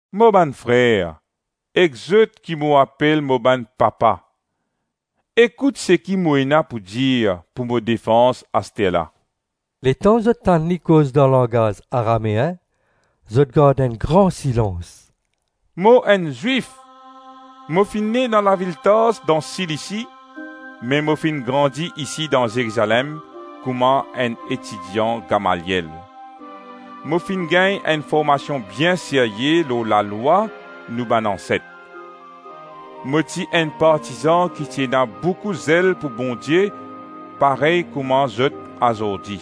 “Mo bann frer, ek zot ki mo apel mo bann papa, ekout seki mo ena pou dir pou mo defans aster la.” Letan zot tann li koz dan langaz Arameen, zot gard enn gran silans. “Mo enn Zwif. Mo finn ne dan lavil Tars dan Silisi, me mo finn grandi isi dan Zerizalem kouma enn etidian Gamaliel. Mo finn gagn enn formasion bien serye lor lalwa nou bann anset. Mo ti enn partizan ki ti ena boukou zel pou Bondie, parey kouma zot azordi.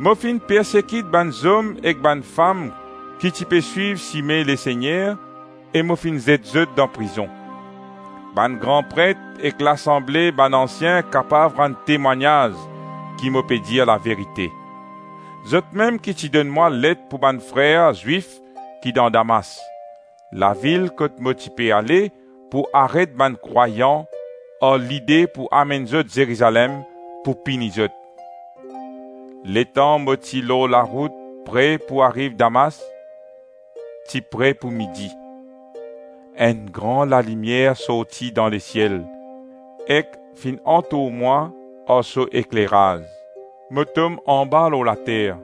Mo finn persekit bann zom ek bann fam ki ti pe swiv Sime Lesegner e mo finn zet zot dan prizon. Bann gran pret ek lasanble bann ansien kapav rann temwagnaz ki mo pe dir laverite. Zotmem ki ti donn mwa let pou bann frer Zwif ki dan Damas, lavil kot mo ti pe ale pou aret bann krwayan ar lide pou amenn zot Zerizalem pou pini zot. Letan mo ti lor larout pre pou ariv Damas, ti pre pou midi, enn gran lalimier sorti dan lesiel ek finn antour mwa ar so ekleraz. Mo tom anba lor later.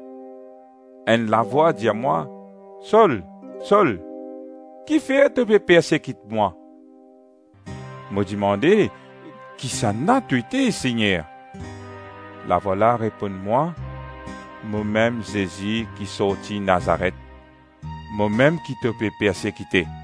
Enn lavwa dir mwa, ‘Sol, Sol, kifer to pe persekit mwa?’ Mo dimande, ‘Kisannla to ete, Segner?’ Lavwa la reponn mwa, ‘Momem Zezi ki sorti Nazaret. Momem ki to pe persekite.’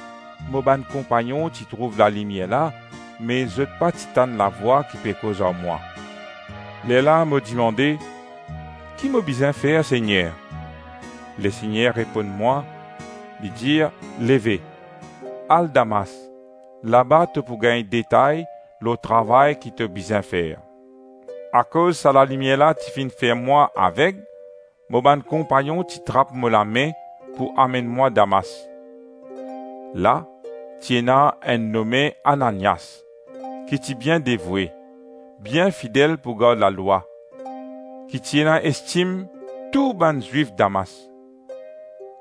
Mo bann konpagnon ti trouv lalimier la, me zot pa ti tann lavwa ki pe koz ar mwa. Lerla mo dimande, ‘Ki mo bizin fer, Segner?’ Lesegner reponn mwa, li dir ‘Leve. Al Damas. Laba to pou gagn detay lor travay ki to bizin fer.’ Akoz sa lalimier la ti finn fer mwa aveg, mo bann konpagnon ti trap mo lame pou amenn mwa Damas. La ti ena enn nome Ananias, ki ti bien devoue, bien fidel pou gard lalwa, ki ti ena estim tou bann Zwif Damas.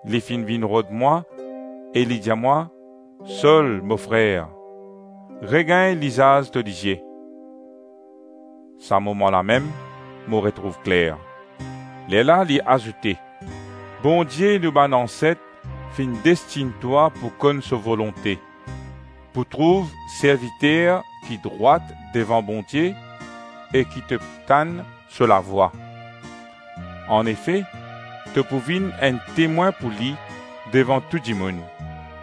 Li finn vinn rod mwa, e li dir mwa, ‘Sol, mo frer, regagn lizaz to lizie!’ Sa moman lamem mo retrouv kler. Lerla li azoute, ‘Bondie nou bann anset finn destinn twa pou konn so volonte, pou trouv Serviter ki drwat devan Bondie, e ki to tann so lavwa. Anefe, to pou vinn enn temwin pou li devan tou dimoun,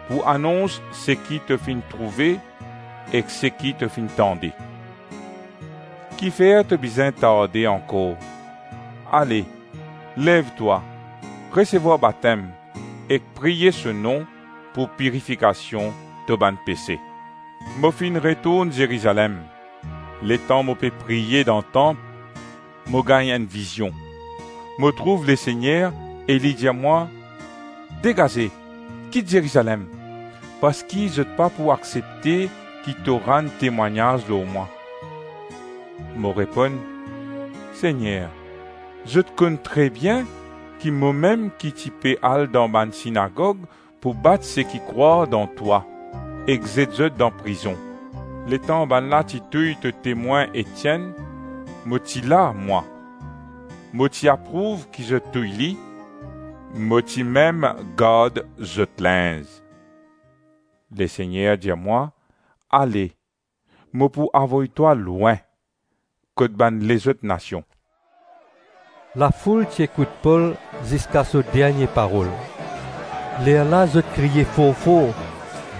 pou anons seki to finn trouve ek seki to finn tande. Kifer to bizin tarde ankor? Ale, lev twa, resevwar batem ek priye so nom pou pirifikasion to bann pese.’ Mo finn retourn Zerizalem. Letan mo pe priye dan tanp, mo gagn enn vizion. Mo trouv Lesegner e li dir mwa, ‘Degaze, kit Zerizalem, parski zot pa pou aksepte ki to rann temwagnaz lor mwa.’ Mo reponn, ‘Segner, zot konn trebien ki momem ki ti pe al dan bann sinagog pou bat seki krwar dan twa, ek zet zot dan prizon. Letan bann la ti touy to temwin Etienn, mo ti la, mwa. Mo ti aprouv ki zot touy li, mo ti mem gard so linz.’ Lesegner dir mwa, ‘Ale, mo pou avoy twa lwin, kot bann lezot nasion!’” Lafoul ti ekout Pol ziska so dernie parol. Lerla zot kriye for-for,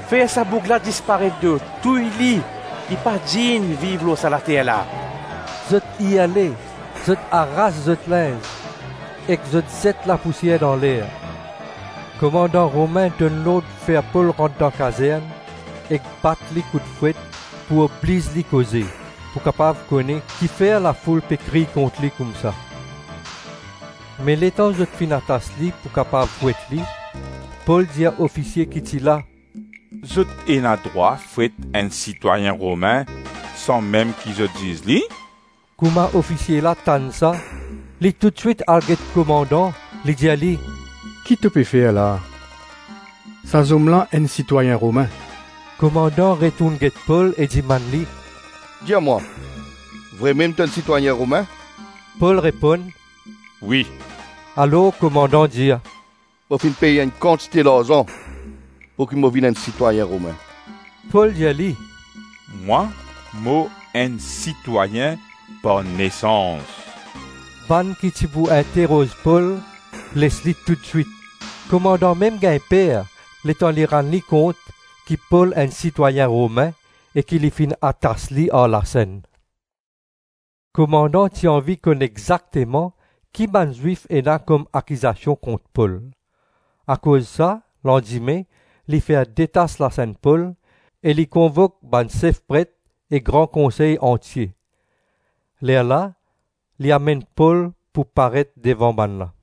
“Fer sa boug la disparet do! Touy li! Li pa dign viv lor sa later la!” Zot irle, zot aras zot linz, ek zot zet lapousier dan ler. Komandan Romin donn lord fer Pol rant dan kazern ek bat li kout fwet pou obliz li koze, pou kapav kone kifer lafoul pe kriy kont li koumsa. Me letan zot fini atas li pou kapav fwet li, Pol dir ofisie ki ti la, “Zot ena drwa fwet enn sitwayin Romin san mem ki zot ziz li?” Kouma ofisie la tann sa, li toutswit al get komandan, li dir li, “Ki to pe fer la? Sa zom la enn sitwayin Romin!” Komandan retourn get Pol e dimann li, “Dir mwa, vremem to enn sitwayin Romin?” Pol reponn, “Wi.” Alors komandan dir, “Mo finn pey enn kantite larzan pouki mo vinn enn sitwayin Romin.” Pol dir li, “Mwa mo enn sitwayin par nesans.” Bann ki ti pou interoz Pol les li toutswit. Komandan mem gagn per letan li rann li kont ki Pol enn sitwayin Romin e ki li finn atas li ar lasenn. Komandan ti anvi konn exakteman ki bann Zwif ena kom akizasion kont Pol. Akoz sa, landime, li fer detas lasenn Pol, e li konvok bann Sef Pret e Gran Konsey antie. Lerla li amenn Pol pou paret devan bannla.